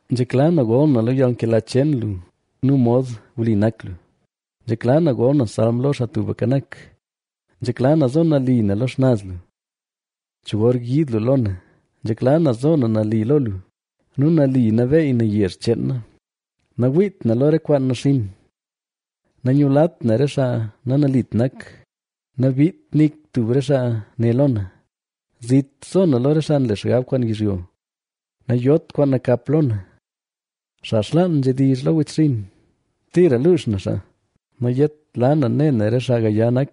Nzhekla na gol na lo yalnkela cheen lu nu mod wli nak lu; nzhekla na gol na salm lo lu, Xaa Tubka Nak. Nzhekla na zo nali na lo xnaz lu. ¿Cho gor yiid lu lo na? Nzhekla na zo na nali lo lu nu nali nabeey na yezh cheen na. Nawiit na lo re kwaan naxinn. Nanyulat na re xaa nanalit nak; nabiit nik tub re xaa ne lo na. Zit zo na lo re xaa nle xgab kwaan yizhyo; nayot kwaan nakap lo na. Xaa xlaan nzhedizh lo wechxinn, tira luux na xaa; ¡nayetla na ne na re xaa gaya nak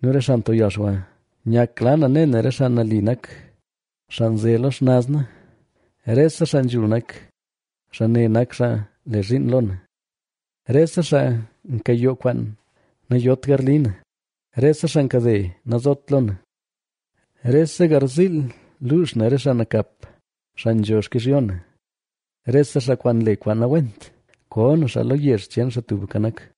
nu re xaa nto yalxwa! Nyakla na ne na re xaa nali nak, xaa nze lo xnaz na; rese xaa nzhul nak, xaa ne nak xaa le zhiin lo na. Rese xaa nkayoo kwaan, nayot garli na; rese xaa nkade, nazot lo na. Rese garziil luux na re xaa nakap, xaa nzho xkizhyo na, rese xaa kwaan nle kwaan nawent, ko na xaa lo yezh cheen Xaa Tubka Nak.